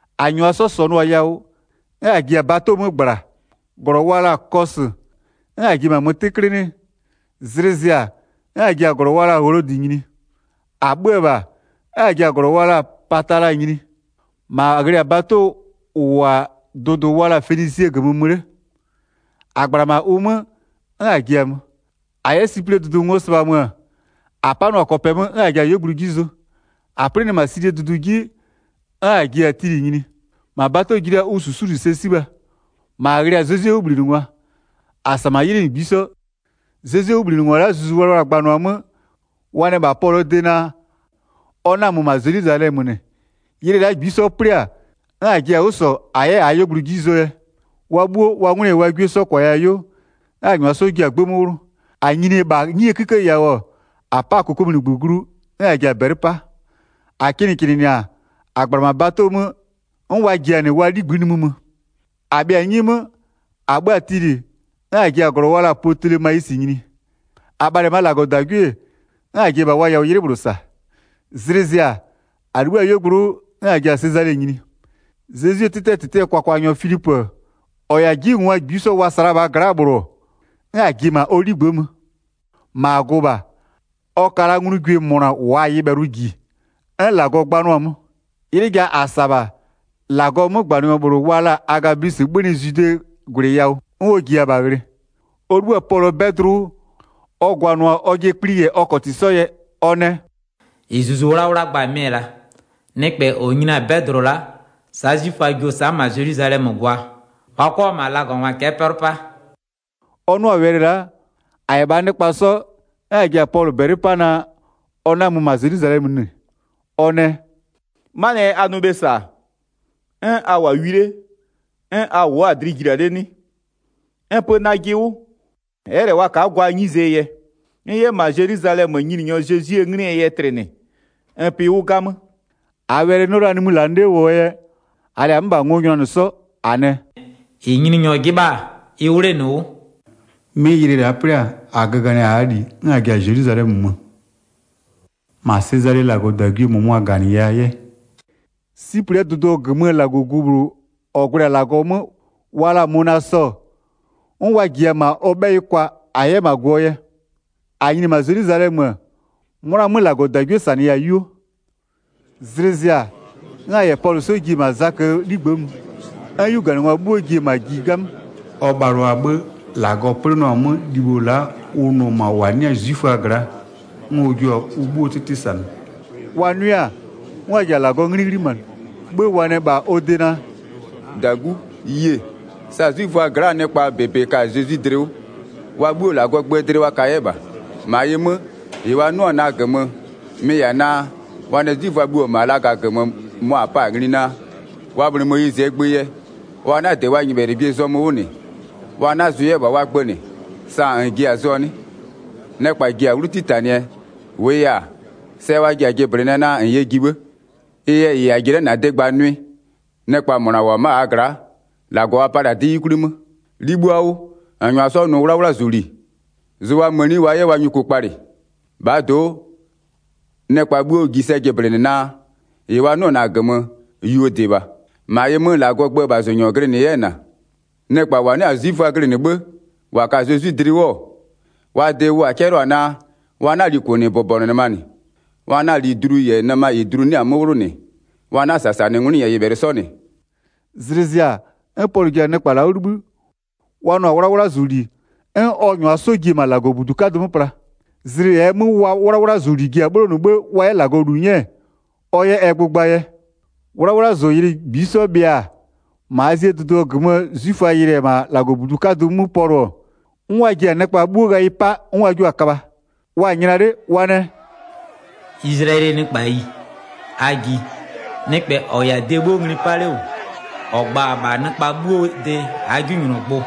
1-A -nyʋa 'sɔ -sɔnʋ-a yawʋ, 'n -a ji-a bato 'mö -gbla, -glɔ wa la-a Kɔsʋ, 'n a ji-e -ma mö 'tɩklɩlɩɩ. Zlɩ zɩ-a, 'n -a ji-a -glɔ wa la-a Wlodɩ nyini. -A 'bhö-ö -bha, 'n -a ji-a -glɔ wa la-a Patala nyini. 2-Ma -a ghlɩ-a bato -ʋ -wʋ-a dʋdʋ wa la-a Fenisie -gömö mö 'le. -A -gbla-a -ma ʋ 'mö, 'n -a ji-a mö. 3-A 'yɛ Siplɩɛ dʋdʋ ngo sɩbha mö-ö, -a 'panʋa-a kɔpɛ 'mö 'n -a ji-a -aa 'yuogblʋ 'ji zʋ. -A 'plɩnɩ-a Silie dʋdʋ 'ji, 'n -a ji-a Tilɩ nyini. -Ma bato ji la-a ʋ -susuli sɛ 'sibha. 4-Ma -a ghlɩ-a Zezwie 'wʋbhlinɩngwa. -A -sa -ma 'ylɩ -ngbisɔ. Zezwie 'wʋbhlinɩngwa la'a Zuzu Wlawla-a gbanʋa-a 'mö, wa nɛ -bha Pɔlʋɔ de naa, ɔ 'na-a mö -ma Zelwizalɛmö -nɩ. 5Ylɩ la'a -ngbisɔ 'plɩ-a, 'n -a ji-a 'wʋ -sɔ -a 'yɛ -aa 'yuogblʋ 'ji zʋɔ yɛ. Wa 'bhuo, wa 'ngwlɩ -yɛ wa 'gwie 'sɔ -kwaya-a 'yuo, 'n -a -nyʋa 'sɔ ji-a 'gbë 'mö 'wlʋ. -A nyini-e -bha 'nyie 'kïkë yawʋ, -a 'pa-a -kokomunigbö glu, 'n -a ji-a -bɛlɩ 'pa. 6-A kɩnɩkɩnɩnɩ-a, -a -gbla-a -ma bato 'mö, 'n wa ji-a -nɩ wa 'ligbï'ï nimï mö. 7-A bhɩa-a 'nyi 'mö, -a 'bhö-a Tilɩ, 'n -a ji-a -glɔ wa la-a Pötolemayisɩ nyini. -A bhalɩ-ɛ -maa -Lagɔdagwie-e, 'n -a ji-e -bha wa yawʋ 'ylɩ -bhlʋ -sa. 8Zlɩ zɩ-a, -a 'libhï-a 'yuogblʋ 'wʋ, 'n -a ji-a Sezale nyini. Zezwie 'tɩtɩɛ -tɩtɩɛ kwakwanyɔ Filipö, -ɔ -yɛ-a 'jiwʋngwa -ngbisɔ wa -sa la-a -bhaa gla'aa -bhlʋ, 'n -a ji-e -ma ɔ 'ligbë'ë mö. -Ma -a gʋ-ʋ -bha. 9Ɔ ka la nglugwie -mʋna -waa-a nyɩbhɛlʋ -ji, 'n -Lagɔ gbanʋa-a 'mö. 10'Ylɩ ja -a -sa-a -bha. -Lagɔɔ 'mögbanɩnyɔ -bhlʋ wa la-a Agabwisɩ 'bhönɩ Zwidee -gwlɩ yawʋ, 11'n ɔ -jiya-a -bha ghlɩ. Ɔ 'libhï-a Pɔlʋɔ 'bɛdlʋ 'wʋ, ɔ gwanʋ-a ɔjɩɛ kpli -yɛ ɔ -kɔtɩ 'sɔ yɛ, ɔ nɛ: “-Ɩ Zuzu 'Wlawla gba-a mɩ-ɛ la'a. Nɩkpɛ -ɔ nyini-a 'bɛdlʋ la'a, sa'a 'zwiföa jio-o sa'a -ma Zelwizalɛmö gwaa, wa 'kɔ-a -ma lagangwa cɛ'ɛ 'pɛlʋ 'pa.” 12-A 'nʋ-a wɛlɩ la'a, -a -yɛ -bhaa nɩkpa 'sɔ, 'n -a ji-a Pɔlʋ -bɛlɩ 'pa naa ɔ 'na-a mö -ma Zelwizalɛmö -nɩ. 13Ɔ nɛ: “'Manɩɛ yɛ a nʋ bhe -sa, 'n a -wʋ-a wi 'le, 'n a wʋ'ʋ-a dlɩ jilia 'le 'nɩ? N pö najɩ 'wʋ, ɛ'ɛ -lɛ wa ka'a gwaa 'nyizee yɛ, n 'yɛ -ma Zelwizalɛmö Nyininyɔ Zezwie 'nglɩɛ yɛ tlɩnɩ, n pɩ 'wʋ 'gamö.” 14-Aa wɛlɩ 'nɩɔ la nimï -lanɩ 'le -wʋɔ yɛ, -aa -lɛ-a 'mö -bha ngo nyʋnanɩ 'sɔ, -a nɛ: “-Ɩ Nyininyɔ 'jɩbha-a ɩ 'wlenɩ 'wʋ.” Pɔlʋ yɛ -ma Zelwizalɛmö nyini 15'Mɩ ylɩ la'a 'plɩ-a, -a göganɩ-a -aa -li, 'n -a ji-a Zelwizalɛmö mö. 16-Ma Sezalee -Lagɔdagwie -mʋmʋa -ganɩya 'yɛ. Siplɩɛ dʋdʋ -gömö -Lagɔgu -bhlʋ -ɔ gwlɛ-a -Lagɔ 'mö wa la-a Mönasɔ, 'n wa -jiya-a -ma ɔ 'bhɛyɩ kwa -a 'yɛ -ma gʋ-ʋɔ yɛ. 17-A nyini-e -ma Zelwizalɛmö-ö, 'mʋna 'mö -Lagɔdagwie -sanɩya-a 'yuo. 18Zlɩ zɩ-a, 'n -a -yɛ Pɔlʋ 'sɔ ji-e -ma Zaköö 'ligbë'ë mö, 'n 'yuganɩngwa 'bhuo ji-e -ma ji 'gamö. 19Ɔ bhalʋa-a 'bhë, -Lagɔ 'plɩnɩɔ-a 'mö libho la'a ʋ nʋ-ɔ -ma -wa 'nɩ-a 'zwiföaa gla'a, 'n ɔ jua-a ʋ 'bhuoo 'tɩtɩ -sanɩ. 20Wa 'nʋɩ-a, 'n wa ji-a -Lagɔɔ 'nglɩ 'ghlimanɩ. 'Bhë wa nɛ -bha ɔ de naa: “-Dagu, yie -sa 'zwiföaa gla'aa nɩkpa -bebe ka-a Zezwi dlɩ 'wʋ. Wa 'bhuo -Lagɔɔ gböö dlɩ wa ka 'yɛ -bha. 21-Ma ɩ 'mö, -ɩ wa 'nʋ-ɔ -na -gömö, mɩ-ɩ -yɛ-a naa, wa nɛ 'zwiföa bhuo -wʋ-ɔ -ma laga -gömö, mʋa -n pa-a ngli naa, wa bhlɩ Moyizɩɛ gbö yɛ, wa 'na-a -dɩ wa nyɩbhɛlɩgwiee zɔmö 'wʋ -nɩ, wa 'na-a zʋ 'yɛ -bha wa gbö -nɩ. 22Sa -n ji-a zʋɔ 'nɩ? Nɩkpa ji-a 'wlu 'titanɩɛ, -wʋʋ yɛ-a, sɛ wa ji-a jɩblɩnɩɛ naa -n yɛ ji 'bhë. 23Ɩ yɛ -ɩ a ji-e la'a -na de gba nʋɩ. Nɩkpa -mʋna -wʋ-ɔ ma'a -aa gla'a, -Lagɔ wa palɩ-a 'dɩ 'yukwli 'mö. 24'Libhua 'wʋ, -n -nyʋa 'sɔ nʋ 'wlawlazʋli, zʋ wa mëni wa 'yɛ wa nyuku kpalɩ. -Bhaa do'o, nɩkpa 'bhuo ji sɛ jɩblɩnɩ naa, -ɩ wa 'nʋ-ɔ -na -gömö, yuodɩ -bha, -ma ɩ 'mö -Lagɔɔ gböö -bhazʋnyɔ -n glɩnɩ 'yɛ-ɛ -na. 25Nɩkpa -wa 'nɩ-a 'zwiföa glɩnɩ 'bhë -wa ka-a Zezwi dlɩ 'wʋ-ɔ, wa de wʋ -a 'cɛlʋa-a naa, wa 'na-a li -kʋnɩbʋbɔnʋnɩma -nɩ, wa 'na-a li dlu -yɛ nɩma -ɩ dlu 'nɩ-a 'mö 'wlʋ -nɩ, wa 'na-a -sasanɩ 'ngwlɩ -yɛ nyɩbhɛlɩ 'sɔ -nɩ.” 26Zlɩ zɩ-a, 'n Pɔlʋ ji-a nɩkpa la'a 'wʋ 'libhï, wa nʋ-a 'wlawlazʋli, 'n ɔ -nyʋa 'sɔ ji-e -ma -Lagɔbudu 'kadʋ 'mö pla. Zlɩ -ɛɛ 'mö wa 'wlawlazʋli ji-a 'bhlonʋ 'bhë wa 'yɛ -Lagɔ -lu 'nyɛ, ɔ 'yɛ ɛ gbʋ gbaa yɛ. Wa yɛ Pɔlʋ köbha 27'Wlawlazʋylɩ -ngbisɔ bhɩa-a, -ma Azie dʋdʋ -gömöö 'zwiföa yɩlɩ-ɛ -ma -Lagɔbudu 'kadʋ 'mö Pɔlʋ-ɔ, 'n wa ji-a nɩkpa 'bhuo ghayɩ 'pa 'n wa jio-a köbha. 28Wa-a nyla 'le, wa nɛ: “Izlayɛlɩɛ nɩkpayi, a ji, nɩkpɛ -ɔ -yɛ-a de 'bhuo ngli 'pa 'le -wʋ -ɔ gba-a -bha nɩkpa 'bhuoo de -aa 'jinylɔgbʋ,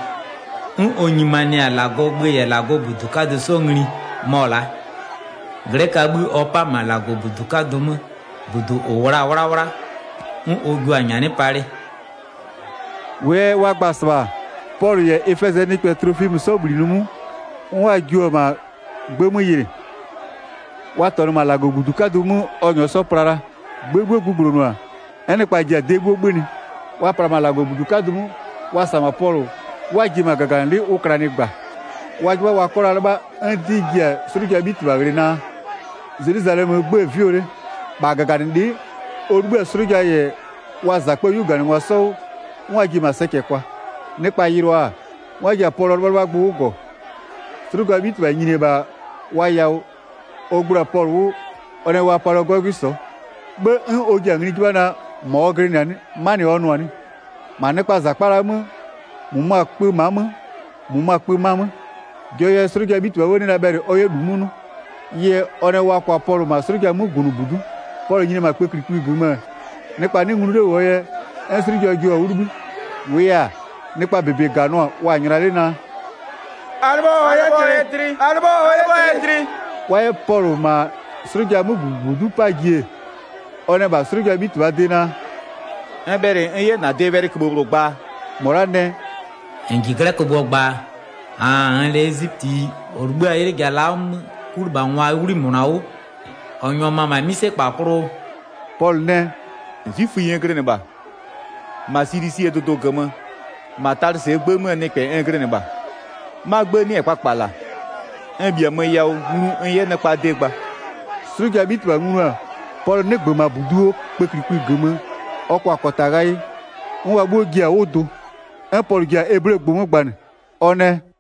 'n ɔ nyimanɩ-a -Lagɔɔ gbö -yɛ -Lagɔbudu 'kadʋ 'sɔ ngli mɔ-ɔ la'a. 'Glɛköaa 'bhï ɔ 'pa-a -ma -Lagɔbudu 'kadʋ 'mö, -budu -ʋ -wʋ la-a 'wlawla 'n ɔ jiʋ-a nyanɩ palɩ.” 29-Wʋʋ yɛ wa gba-a -sɩbha, Pɔlʋ -yɛ Efɛzɩɛ nɩkpɛ Tlofimö 'sɔ -bhlinɩ 'wʋ 'n wa jio-o -ma 'gbë 'mö yɩlɩ. Wa -tɔnʋ -ma -Lagɔbudu 'kadʋ 'mö ɔ -nyɔɔ 'sɔ pla la. 30'Gbë 'bhuo gbugblonʋ-a, 'n nɩkpa ji-a de 'bhuo 'bhönɩ. Wa pla-a -ma -Lagɔbudu 'kadʋ 'mö, wa -sa-a -ma Pɔlʋ, 'n wa ji-e -bha -gaganɩlɩ'ɩ ʋ klanɩ -gba. 31Wa 'jɩbha wa 'kɔ la 'lɩbha, 'n 'dɩ ji-a 'slʋjaa 'bhitɩbha ghlɩ naa, Zelwizalɛmöö 'gbë-ë 'vɩɔ 'le. 32-Bha -gaganɩlɩ'ɩ, ɔ 'libhï-a 'slʋja -yɛ wa -zakpöö 'yuganɩngwa 'sɔ 'wʋ, 'n ɔ ji-e -ma sɛcɛ kwa. Nɩkpa yɩlʋa-a, 'n wa ji-a Pɔlʋɔ 'lɩbhalɩbhagbʋ 'wʋ -gɔ. 33'Slʋjaa 'bhitɩbha nyini-e -bha wa yawʋ, ɔ gblo-a Pɔlʋ 'wʋ, ɔ nɛ wa palɩɔ 'gɔgwɩ sɔ'ɔ. 'Bhë 'n ɔ ji-a ngli 'jɩbha naa, -mɔ ɔ glɩnɩ-a 'nɩ? 'Manɩ ɔ nʋ-a 'nɩ? 34-Ma nɩkpaa -zakpa la'aa 'mö, -mʋmʋa 'kpö ma'a 'mö -mʋmʋa kpö -ma 'mö, jɔɔ yɛ 'slʋjaa 'bhitɩbha 'nɩ la bhɛlɩ ɔ 'yɛ -lu 'mö 'nʋ. Ɩ yɛ, ɔ nɛ wa kwa Pɔlʋ -ma 'slʋjaa 'mögunʋbudu'u. 35Pɔlʋ nyini-e -bha kpëklikpï -gömö-ö, nɩkpa 'nɩ nglu 'le -wʋɔ yɛ, 'n 'slʋja jio-a 'wʋ 'libhï. 36-Wʋʋ yɛ-a, nɩkpaa -bebe -ganʋa, wa-a nyla 'le naa: “A 'lɩbhɔ ɔ 'yɛ tlɩ!” Pɔlʋ yɛ ɔjɩɛ gbʋɔ -gömösawɛlɩ gba 37Wa 'yɛ Pɔlʋ -ma 'slʋjaa 'mögunʋbudu'u 'paa ji-e, ɔ nɛ -bha 'slʋjaa 'bhitɩbhaa de naa: “N bhɛlɩ n 'yɛ -na de wɛlɩköbhë -bhlʋ gbaa?” -Mɔ la'a nɛ: “-N -ji 'glɛkögbʋɔ gbaa? 38-Aan -nn -lɛ ezipötiyi -ɔ 'libhï-a 'ylɩ ja la'a 'mö 'kulɩbhangwaa 'wli -mʋna 'wʋ -ɔ -nyʋa mö-ö -ma 'mïsekpa klʋʋ?” 39Pɔlʋ nɛ: “'Zwiföyi n glɩnɩ -bha, -ma Silisie dʋdʋ -gömö, -ma Talɩsɩɛ 'gbë 'möö nɩkpɛ n glɩnɩ -bha, 'ma 'gbë 'nɩ-ɛ kpakpala. N -bhiamö yawʋ, nglu n 'yɛ nɩkpaa de gba.” 40'Slʋjaa 'bhitɩbha nglu-a, Pɔlʋ 'nɩgbö -bha -buduo kpëklikpï -gömö ɔ kwa-a -kɔta ghayɩ, 'n wa 'bhuo ji-a 'wʋ dʋ. 'N Pɔlʋ ji-a eblegbʋ 'mö gbanɩ. Ɔ nɛ: